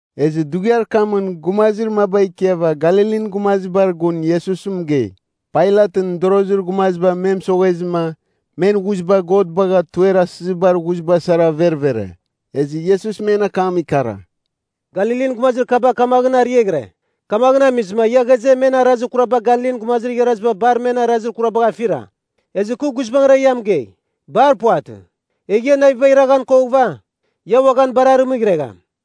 Ezɨ dughiar kamɨn gumazir maba ikiava Galilin gumazibar gun Iesus mɨgei, Pailatɨn mɨdorozir gumaziba me mɨsoghezɨma men ghuziba God bagha tuer asizibar ghuziba sara verevere. Ezɨ Iesus men akam ikara, “Galilin gumazir kaba kamaghɨn ariaghɨre. Kamaghɨn amizɨma ia ghaze men arazir kuraba Galilin gumazir igharaziba bar men arazir kurabagh afira? Ezɨ kɨ guizbangɨra ia mɨgei, bar puvatɨ! Egh ia navibagh iraghan koghɨva, ia uaghan bar arɨmɨghregham.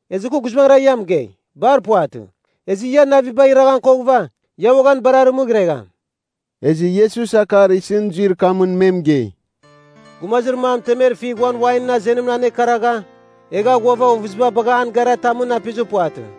Ezɨ kɨ guizbangɨra ia mɨgei, bar puvatɨ. Ezɨ ia navibagh iraghan koghɨva, ia uaghan bar arɨmɨghregham.” Ezɨ Iesus akar isɨn zuir kamɨn me mɨgei, “Gumazir mam temer figh uan wainɨn azenimɨn anekaragha egha ghuava ovɨziba bagha an gara tamɨn apizir puvatɨ.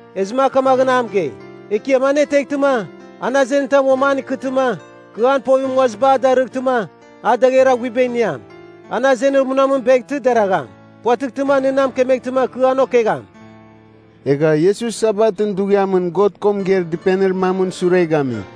“Ezɨma a kamaghɨn a mɨgei, ‘Ekiam aneteghtɨma, an azenir tam uam an ikɨtɨma, kɨ an povimɨn nguaziba a darɨghtɨma a dagher aghuiba iniam. An azenir munamɨn beghtɨ, deragham. Puvatɨghtɨma nɨ na mɨkemeghtɨma kɨ an okegham.’” Egha Iesus Sabatɨn dughiamɨn God ko mɨgeir dɨpenir mamɨn sure gami.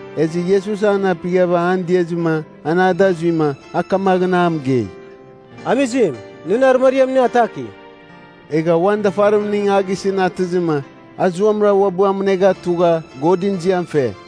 Ezɨ Iesus an apighava an diazɨma an ada zuima, a kamaghɨn a mɨgei, “Amizim, nɨn arɨmariam nɨ ataki.” Egha uan dafarimning a gisɨn atɨzɨma, a zuamɨra uabɨ amɨnegha tugha, Godɨn ziam fe.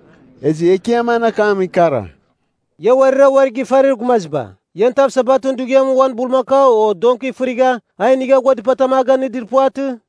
Ezɨ Ekiam an akam ikara, “Ia uarira uari gifarir gumaziba! Ian tav Sabatɨn dughiamɨn uan bulmakau o donki fɨrigha a inigha ghua dɨpatam a ganɨdir puvatɨ?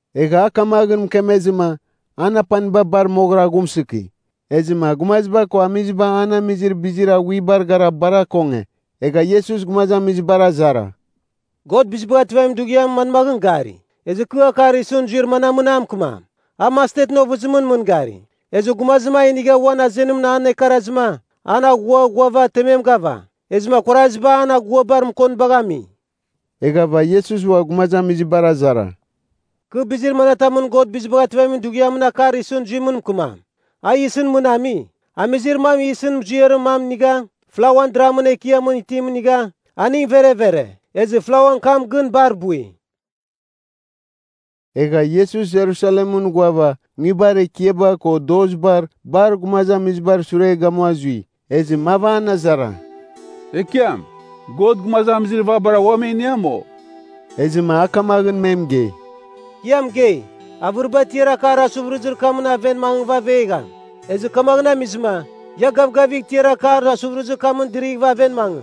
Egha a kamaghɨn mɨkemezɨma, an apaniba bar moghɨra aghumsɨki. Ezɨma gumaziba ko amiziba an amizir bizir aghuibar gara bar akonge. Egha Iesus gumazamizibar azara, “God Bizibagh Ativamin Dughiam manmaghɨn gari? Ezɨ kɨ akar isɨn zuir manamɨn a mɨkɨmam? A mastetɨn ovɨzim mɨngari. Ezɨ gumazim a inigha uan azenimɨn an ekarazɨma, an aghua ghuava temem gava. Ezɨma kuaraziba an aguabar mɨkonibagh ami.” Eghava Iesus ua gumazamizibar azara, “Kɨ bizir manatamɨn God Bizibagh Ativamin Dughiamɨn akar isɨn zuim mɨkɨmam? A yisɨn mɨn ami. Amizir mam yisɨn muziarir mam inigha, flauan dramɨn ekiamɨn itim inigha, aning verevere. Ezɨ flauan kam gɨn bar bui.” Egha Iesus Jerusalemɨn ghuava nguibar ekiaba ko dozibar bar gumazamizibar sure gamua zui. Ezɨ mav an azara, “Ekiam, God gumazamizir vabara ua me iniam, o?” Ezɨma a kamaghɨn me mɨgei, “Kɨ ia mɨgei, avɨriba tiar akar asuvɨrɨzir kamɨn aven mangɨva avegham. Ezɨ kamaghɨn amizɨma ia gavgavigh tiar akar asuvɨrɨzir kamɨn dɨrighɨva aven mangɨ.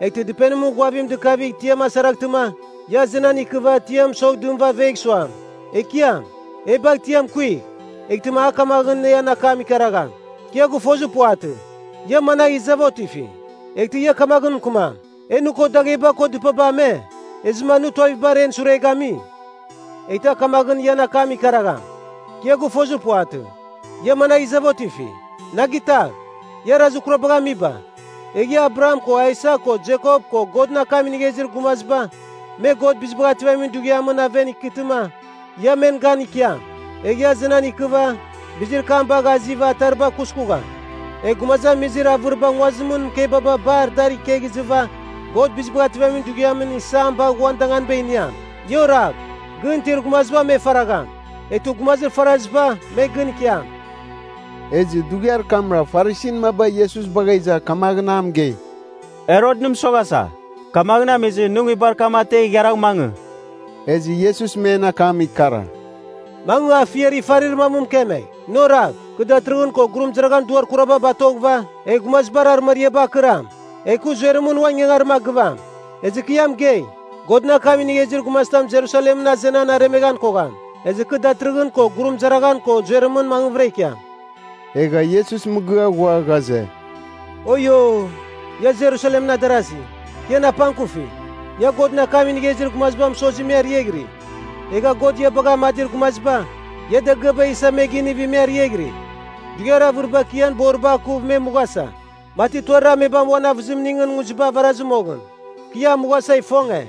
Eghtɨ dɨpenimɨn ghuavim dɨkavigh tiam asaraghtɨma. Ia azenan ikɨva tiam mɨsogh dɨmɨva avegh suam, ‘Ekiam, e bagh tiam kuigh.’ Eghtɨma a kamaghɨn ian akam ikaragham, ‘Kɨ ia gɨfozir puvatɨ. Ia managh izava otifi?’ “Eghtɨ ia kamaghɨn mɨkɨmam, ‘E nɨ ko dagheba ko dɨpaba ame. Ezɨma nɨ tuavibar en sure gami.’ “Eghtɨ a kamaghɨn ian akam ikaragham, ‘Kɨ ia gɨfozir puvatɨ. Ia managh izava otifi. Na gitagh, ia arazir kurabagh amiba!’ “Egh ia, Abraham ko Aisak ko Jekop ko Godɨn akam inigha izir gumaziba me God Bizibagh Ativamin Dughiamɨn aven ikɨtɨma ia men gan ikiam. Egh ia azenan ikɨva bizir kam bagh aziva atariba kuskugham. Egh gumazamizir avɨriba nguazimɨn mɨkebaba bar dar ikegh izɨva God Bizibagh Ativamin Dughiamɨn isam bagh uan danganiba iniam. Ia oragh, gɨn itir gumaziba me faragham, eghtɨ gumazir faraziba me gɨn ikiam.” Ezɨ dughiar kamra Farisin maba Iesus bagha iza kamaghɨn a mɨgei, “Herot nɨ mɨsoghasa. Kamaghɨn amizɨma nɨ nguibar kam ategh igharagh mangɨ.” Ezɨ Iesus men akam ikara, “Mangɨ afiar ifarir mam mɨkemegh, ‘Nɨ oragh, kɨ datɨrɨghɨn ko gurumɨzaraghan duar kuraba batoghɨva egh gumazibar arɨmariaba akɨram. Egh kɨ zuerɨmɨn uan ingangarim a gɨvam.’ Ezɨ kɨ ia mɨgei, Godɨn akam inigha izir gumazitam Jerusalemɨn azenan aremeghan kogham. Ezɨ kɨ datɨrɨghɨn ko gurumɨzaraghan ko zuerɨmɨn mangvɨra ikiam.” Egha Iesus mɨgɨa ghua ghaze, “Oio, ia Jerusalemɨn adarazi, kɨ ian apangkufi! Ia Godɨn akam inigha izir gumaziba mɨsozi me ariaghiri, egha God ia bagha amadir gumaziba, ia dagɨaba isa, me ginivi, me ariaghiri. Dughiar avɨribar kɨ ian boriba akuv me mughasa, mati tuarir amebam uan avɨzimingɨn nguziba avarazɨ moghɨn, kɨ ia damuasa ifonge.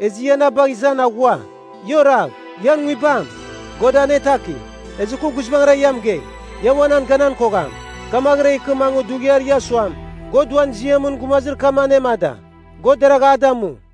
Ezɨ ia na bagh izan aghua. Ia oragh! Ian nguibam, God anetaki. Ezɨ kɨ guizbangɨra ia mɨgei, ia ua nan ganan kogham kamaghɨra ikɨ mangɨ dughiar ia suam, ‘God uan ziamɨn gumazir kam anemada! God deragh a damu!’”